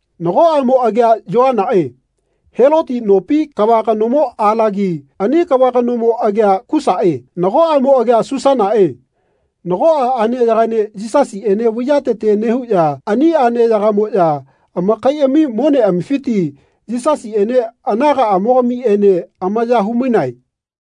Nago aꞌmo agia Yoanaꞌe Heloti nopi kava kanomo alagi. Ani kava kanomo agia Susaꞌe. Nago aꞌmo agia Susanaꞌe nagoꞌa aꞌneyagaene Yisasiꞌene vaiyatete nehuꞌya ani aꞌneyagamoꞌya amakaiꞌami moneꞌamifiti Yisasiꞌene anagaꞌamogamiꞌene amaya humainae.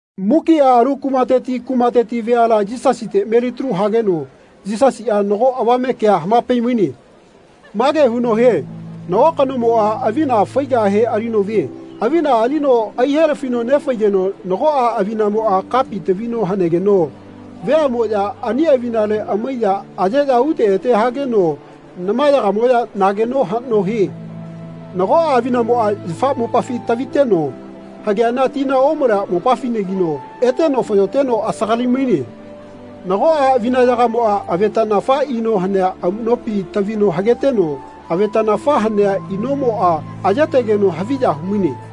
Mukiꞌa alu kumateti kumateti veala Yisasite melitalu hageno Yisasiꞌa nago avame kea hamapaimaine. Mage huno hie “Nago kanomoꞌa avina faigahe alino vie. Avina alino aihelafino nefaigeno nagoꞌa avinamoꞌa kapi tavino hanegeno veaꞌmoꞌya ani avinale amaiya ayeꞌya ute ete hageno namayagamoꞌya nageno haꞌno hie. Nagoꞌa avinamoꞌa yafa mopafi taviteno hageana tina omalea mopafinagino eteno fayoteno asagalimaine. Nagoꞌa avinayagamoꞌa avetaꞌnafa ino hanea amuꞌnopi tavino hageteno avetaꞌnafa hanea inoꞌmoꞌa ayetegeno haviya humaine.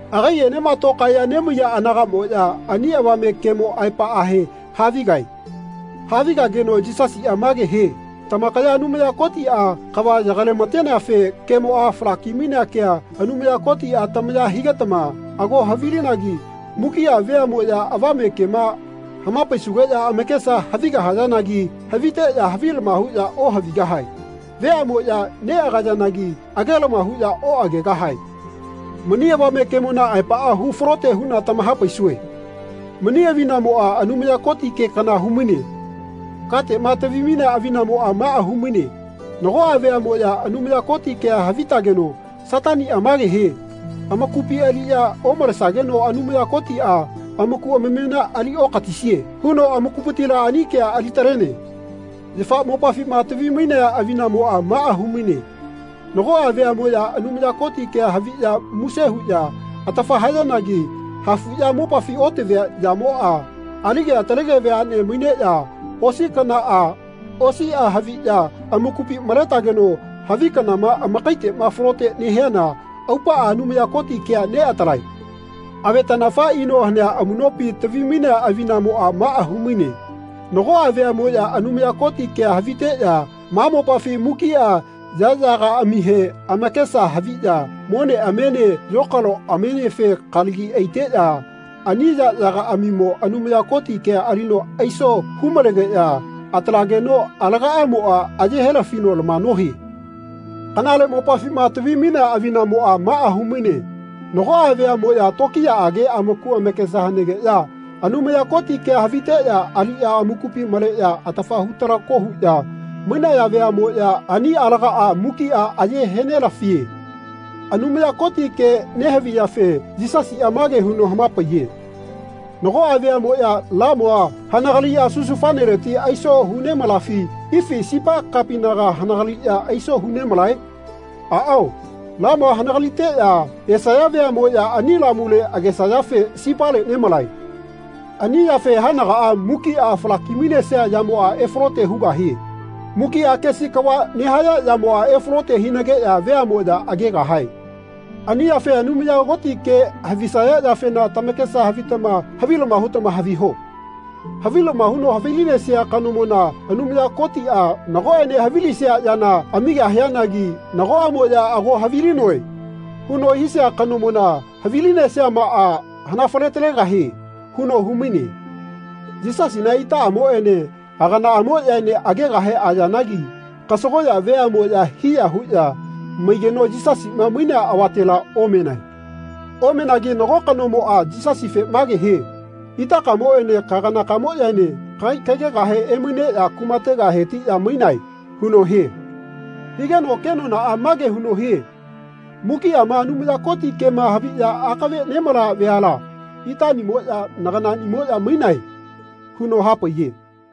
Agaiꞌenema tokaeꞌya nemaiya anagaꞌmoꞌya ani avame kemo aepaꞌahe havigae. Havigageno Yisasiꞌa mage hie “Tamakaya Anumaya Kotiꞌa kava yagailamateneafe kemoꞌa falaki mainea kea Anumaya Kotiꞌa tamaya higetama ago havilinagi mukiꞌa veaꞌmoꞌya avame kema hamapaisugeꞌya amakesa havigahagi haviteꞌya havilama huꞌya ohavigahae. Veaꞌmoꞌya neꞌagayanagi agelama huꞌya oꞌagegahae. Mani avame kemona aepaꞌa hu falote huꞌna tamahapaisue. Mani avinamoꞌa Anumaya Koti ke kana humaine. Kateꞌma tavimainea avinamoꞌa maꞌa humaine nagoꞌa veaꞌmoꞌya Anumaya Koti kea havitageno Sataniꞌa mage hie ‘Amakupi aliꞌya omalesageno Anumaya Kotiꞌa amaku amamena ali okatisie.’ huno amakupitila ani kea alitalene. Yafa mopafima tavimainea avinamoꞌa maꞌa humaine nagoꞌa veaꞌmoꞌya Anumaya Koti kea haviꞌya muse huꞌya atafa hayanagi hafuꞌya mopafi otavia yamoꞌa alige atalege veaꞌne maineꞌya osi kanaꞌa osiꞌa haviꞌya amakupi maletageno havi kanama amakaiteꞌma falote nehiana aupaꞌa Anumaya Koti kea neꞌatalae. Avetaꞌnafa ino hanea amuꞌnopi tavimainea avinamoꞌa maꞌa humaine nagoꞌa veaꞌmoꞌya Anumaya Koti kea haviteꞌya ma mopafi mukiꞌa yaꞌyagaꞌamihe amakesa haviꞌya moneꞌamiene yokaloꞌamienefe kalagi aiteꞌya ani yaꞌyagaꞌamimo Anumaya Koti kea alino aiso humalegeꞌya atalageno alagaꞌamoꞌa aye helafino lama nohie. Kanale mopafima tavimainea avinamoꞌa maꞌa humaine nagoꞌa veaꞌmoꞌya tokiyaꞌage amaku amakesa hanegeya Anumaya Koti kea haviteꞌya aliꞌya amakupi maleꞌya atafa hu talako huꞌya mainaya veaꞌmoꞌya ani alagaꞌa mukiꞌa aye henelafie.” Anumaya Koti ke nehaviyafe Yisasiꞌa mage huno hamapaiye “Nagoꞌa veaꞌmoꞌya lamua hanagaliꞌya susufaneleti aiso hu nemalafi ifi sipa kapinaga hanagaliꞌya aiso hu nemalae? Aꞌao lamua hanagaliteꞌya esaya veaꞌmoꞌya ani lamule agesayafe sipale nemalae. Ani yafe haenagaꞌa mukiꞌa falakimainesia yamoꞌa efalote hugahie. Mukiꞌa kesi kava nehaya yamoꞌa efalote hinageꞌya veaꞌmoꞌya agegahae. Ani yafe Anumaya Koti ke havisaya yafena tamakesa havitama havilama hutama haviho. Havilama huno havilinesia kanomona Anumaya Kotiꞌa nagoꞌene havilisia yana amigahianagi nagoꞌamoꞌya ‘Ago havilinoe.’ huno hisia kanomona havilinesiamaꞌa hanafaletalegahie.” huno humaine. Yisasina itaꞌamoꞌene aganaꞌamoꞌyaene agegahe ayanagi kasagoꞌya veaꞌmoꞌya hiya huꞌya maigeno Yisasiꞌma mainea avatela omenae. Omenagi nago kanomoꞌa Yisasife mage hie “Itakamoꞌene kaganakamoꞌyaene kagai kagegahe emaineꞌya kumatega hetiꞌya mainae.” huno hie. Higeno kenonaꞌa mage huno hie “Mukiꞌama Anumaya Koti kema haviꞌya akave nemalaya veala itaꞌnimoꞌya naganaꞌnimoꞌya mainae.” huno hapaiye.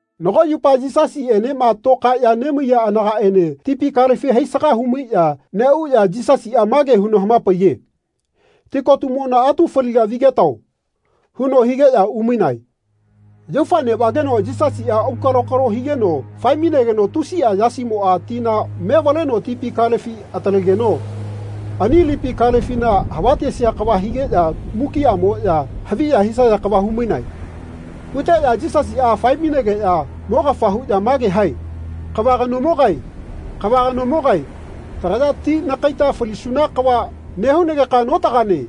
Nago yupa Yisasiꞌenema tokaeꞌya nemaiya anagaꞌene tipi kalefi haisaga humaiꞌya neꞌuꞌya Yisasiꞌa mage huno hamapaiye “Tikotumona atu faliga vigetao.” huno higeꞌya umainae. Yaufa neꞌvageno Yisasiꞌa aukalokalo higeno faemainegeno tusiꞌa yasimoꞌa tina mevaleno tipi kalefi atalegeno ani lipi kalefina havatesia kava higeꞌya mukiꞌamoꞌya haviya hisaya kava humainae. Huteꞌya Yisasiꞌa faemainegeꞌya mogafa huꞌya mage hae “Kava kanomogae, kava kanomogae tagaya ti nakaita falisuna kava nehunageka notagane.”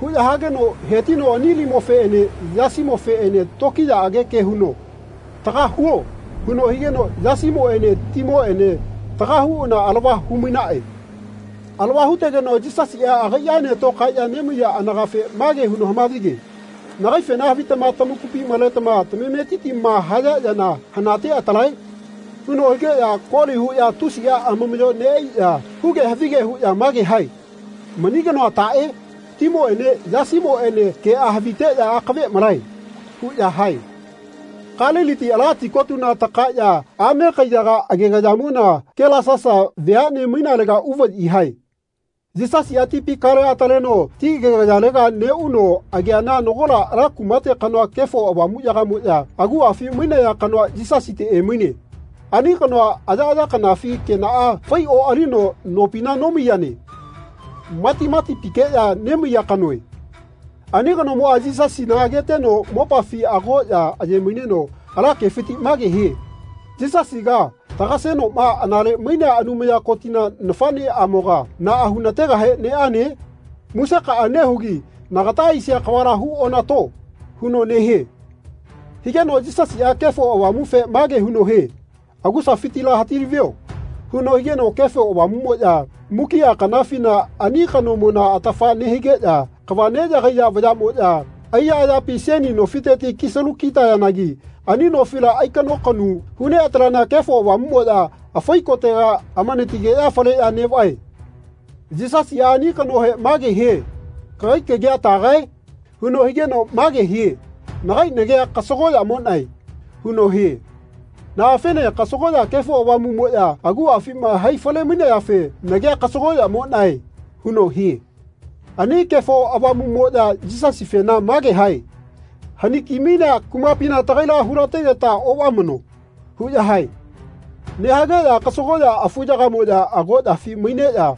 huꞌya hageno hetino ani limofeꞌene yasimofeꞌene tokiyaꞌage ke huno “Taga huo.” huno higeno yasimoꞌene timoꞌene taga huꞌana alava humainaꞌe. Alava hutegeno Yisasiꞌa agaiꞌaene tokaeꞌya nemaiya anagafe mage huno hamavige “Nagaifena havitama tamakupi maletama tamametitima haya yana hanate atalae?” huno higeꞌya koli huꞌya tusiꞌa amamaꞌyo neꞌaiꞌya huge havige huꞌya mage hae “Mani kanoa taꞌe? Timoꞌene yasimoꞌene keꞌa haviteꞌya akave malae.” huꞌya hae. Kaliliti ala tikotuna takaeꞌya ame kaiyaga agegayamona Kelasasa veaꞌne mainalega uvaꞌyi hae. Yisasiꞌa tipi kalea ataleno ti agegayalega neꞌuno ageana nagola ala kumate kanoa Kefo Avamuꞌyagamoꞌya aguꞌafi mainaya kanoa Yisasite emaine. Ani kanoa ayaꞌaya kanafi kenaꞌa fai oꞌalino nopina nomaiyane. Matimatipikeꞌya nemaiya kanoe. Ani kanomoꞌa Yisasina ageteno mopafi agoꞌya ayemaineno ala kefiti mage hie “Yisasiga tagasenoꞌma anale mainea Anumaya Kotina nafaꞌneꞌamoga naꞌa hunategahe neꞌane? Musekaꞌa nehugi nagata aisia kavala hu onato.” huno nehie. Higeno Yisasiꞌa Kefo Avamufe mage huno hie “Agusafitila hatilavio.” huno higeno Kefo Avamuꞌmoꞌya mukiꞌa kanafina ani kanomona atafa nehigeꞌya kava neꞌyagaiya vayaꞌmoꞌya aiya ayapi seni nofiteti kisalu kitayanagi ani nofila aikaꞌnokaꞌnu huneꞌataleana Kefo Avamuꞌmoꞌya afai kotega anatigeno faleno neꞌviane. Yisasiꞌa ani kanohe mage hie “Kagai kagia tagae?” huno higeno mage hie “Nagai nagia kasagoꞌyamoꞌnae.” huno hie. Naꞌafene kasagoꞌya Kefo Avamuꞌmoꞌya aguꞌafima hai falemainayafe “Nagia kasagoꞌyamoꞌnae.” huno hie. Ani Kefo Avamuꞌmoꞌya Yisasifena mage hae “Hanikimainea kumapina tagaila hulategeta oꞌvamano.” huꞌya hae. Nehageꞌya kasagoꞌya afuyagamoꞌya agoꞌyafi maineꞌya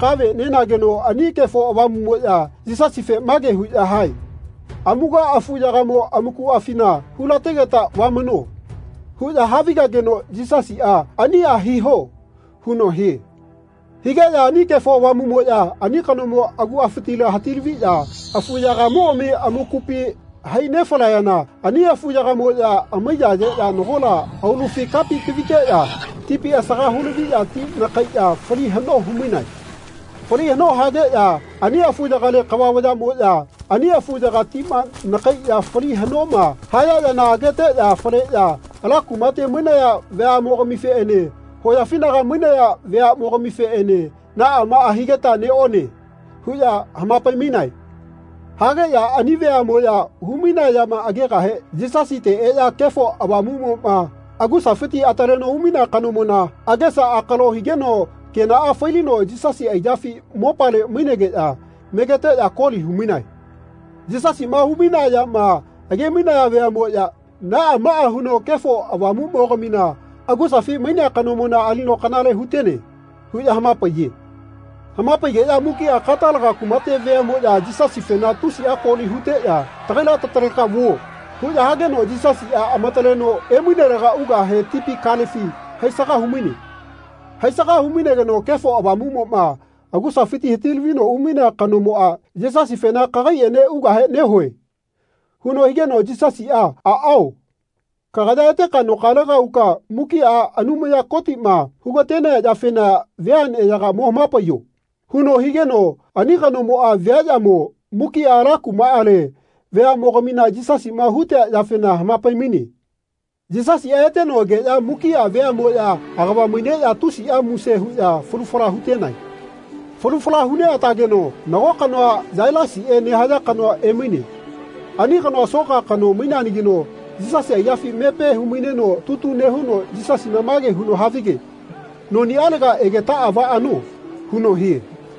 kave nenageno ani Kefo Avamuꞌmoꞌya Yisasifena mage huꞌya hae “Amuga afuyagamo amakuꞌafina hulategeta vamano.” huꞌya havigageno Yisasiꞌa “Aniꞌa hiho.” huno hie. Higeꞌya ani Kefo Avamuꞌmoꞌya ani kanomo aguꞌafitila hatilaviꞌya afuyagamogami amakupi hai nefalayana ani afuyagamoꞌya amaiyayeꞌya nagola aulufi kapi taviteꞌya tipi asaga hulaviꞌya ti nakaiꞌya fali haꞌno humainae. Fali haꞌno hageꞌya ani afuyagale kava vayaꞌmoꞌya ani afuyaga tima nakaiꞌya fali haꞌnoma haya yana ageteꞌya faleꞌya ala kumate mainaya veaꞌmogamifeꞌene hoyafinaga mainaya veaꞌmogamifeꞌene “Naꞌa maꞌa higeta neꞌone.” huꞌya hamapaimainae. Hageꞌya ani veaꞌmoꞌya humainea yama agegahe Yisasite eꞌya Kefo Avamuꞌmoꞌma agusafiti ataleno umainea kanomona agesa akalo higeno kenaꞌa failino Yisasi aiyafi mopale mainegeꞌya megeteꞌya koli humainae. Yisasiꞌma humainea yama agemainaya veaꞌmoꞌya “Naꞌa maꞌa huno Kefo Avamuꞌmogamina agusafi mainea kanomona alino kanale hutene.” huꞌya hamapaiye. Hamapaigeꞌya mukiꞌa Katalaga kumate veaꞌmoꞌya Yisasifena tusiꞌa koli huteꞌya “Tagaila tataleka vuo.” huꞌya hageno Yisasiꞌa amataleno emainelega ugahe tipi kalefi haisaga humaine. Haisaga hunemaigeno Kefo Avamuꞌmoꞌma agusafiti hatilavino umainea kanomoꞌa Yisasifena “Kagaiꞌene ugahe nehue.” huno higeno Yisasiꞌa “Aꞌao kagaya eteka nokalega uka mukiꞌa Anumaya Kotiꞌma hugatenea yafena veaꞌneyaga mo hamapaiyo.” huno higeno ani kanomoꞌa viaꞌyamo mukiꞌa ala kumaꞌale veaꞌmogamina Yisasiꞌma hutea yafena hamapaimaine. Yisasiꞌa eteno egeꞌya mukiꞌa veaꞌmoꞌya agava maineꞌya tusiꞌa muse huꞌya falu fala hutenae. Falu fala huneꞌatageno nago kanoa Yailasiꞌe nehaya kanoa emaine. Ani kanoa soka kano maineanagino Yisasi aiyafi mepe humaineno tutu nehuno Yisasina mage huno havige “Noniꞌalega egetaꞌa vaꞌano.” huno hie.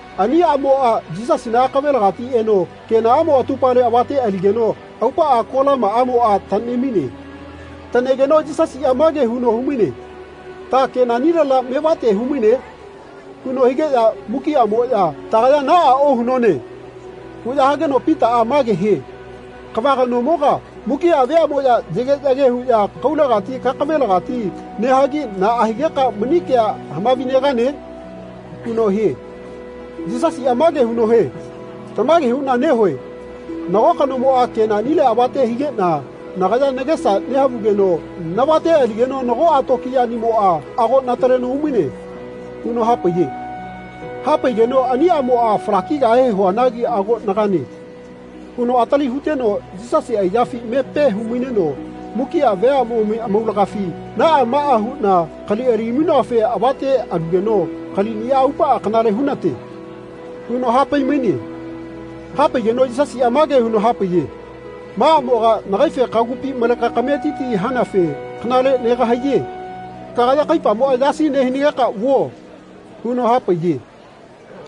Ani aꞌmoꞌa Yisasina akavelagati eno kenaꞌamo atupale avate aligeno aupaꞌa kolamaꞌamoꞌa taꞌnemaine. Taꞌnegeno Yisasiꞌa mage huno humaine “Ta kenaꞌnilela mevate humaine?” huno higeꞌya mukiꞌamoꞌya “Tagaya naꞌa ohunone.” huꞌya hageno Pitaꞌa mage hie “Kava kanomoga mukiꞌa veaꞌmoya yageꞌyage huꞌya kaulegati kakavelagati nehagi naꞌa higeka mani kea hamavinegane?” huno hie. Yisasiꞌa mage huno hie “Tamage huꞌna nehue nago kanomoꞌa kenaꞌnile avate higeꞌna nagaya nagesa nehavugeno navate aligeno nagoꞌa tokiyaꞌnimoꞌa ago nataleno umaine.” huno hapaiye. Hapaigeno ani aꞌmoꞌa “Falakigahe huanagi ago nagane.” huno atili huteno Yisasi aiyafi mepe humaineno mukiꞌa veamogami amaulagafi “Naꞌa maꞌa huꞌna kali alimainoafe avate alugeno kaliꞌniꞌa aupaꞌa kanale hunate.” huno hapaimaine. Hapaigeno Yisasiꞌa mage huno hapaiye “Ma aꞌmoga nagaife kagupi maleka kametiti hanafe kanale negahaiye kagaya kaipamoꞌa yasi nehinageka vuo.” huno hapaiye.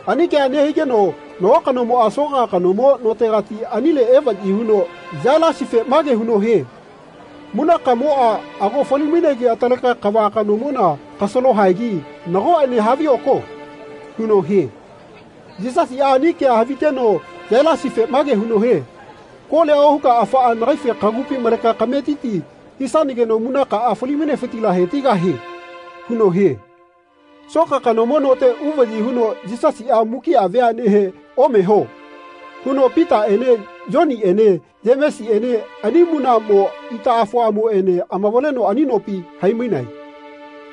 Ani kea nehigeno nago kanomoꞌa soka kanomo notegati anile evaꞌyi huno Yailasife mage huno hie “Munakamoꞌa ago falimainegi ataleka kava kanomona kasalo haegi nagoꞌene havioko.” huno hie. Yisasiꞌa ani kea haviteno Yailasife mage huno hie “Kolia ohuka afaꞌa nagaife kagupi maleka kametiti hisanageno munakaꞌa falimainefitila hetigahie.” huno hie. Soka kanomo note uvaꞌyi huno Yisasiꞌa mukiꞌa veaꞌnehe “Omeho.” huno Pitaꞌene Yoniꞌene Yemesiꞌene ani munaꞌmo itaꞌafoꞌamoꞌene amavaleno ani nopi haimainae.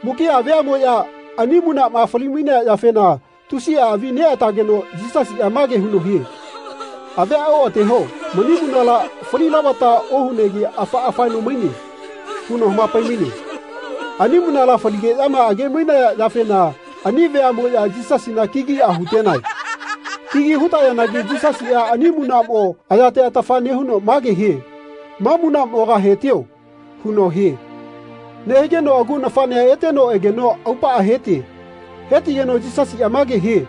Mukiꞌa veaꞌmoꞌya ani munaꞌma falimainea yafena tusiꞌa avi neꞌatageno Yisasiꞌa mage huno hie “Avia oꞌateho mani munala falilavata ohunegi afaꞌa faeno maine.” huno hamapaimaine. Ani munala faligeꞌyama agemainaya yafena ani veaꞌmoꞌya Yisasina kigiꞌa hutenae. Kigi hutayanagi Yisasiꞌa ani munaꞌmo ayate atafa nehuno mage hie “Ma munaꞌmoga hetio.” huno hie. Nehigeno agu nafaꞌnea eteno egeno aupaꞌa hetie. Hetigeno Yisasiꞌa mage hie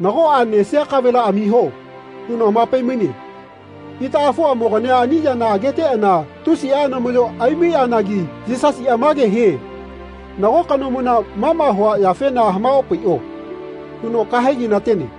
“Nagoꞌa nesia kavela amiho.” huno hamapaimaine. Itaꞌafoꞌamogania ani yana ageteꞌana tusiꞌa anamaꞌyo aimaiꞌanagi Yisasiꞌa mage hie “Nago kanomona ma ma hua yafena hamaopaiꞌo.” huno kaheginatene.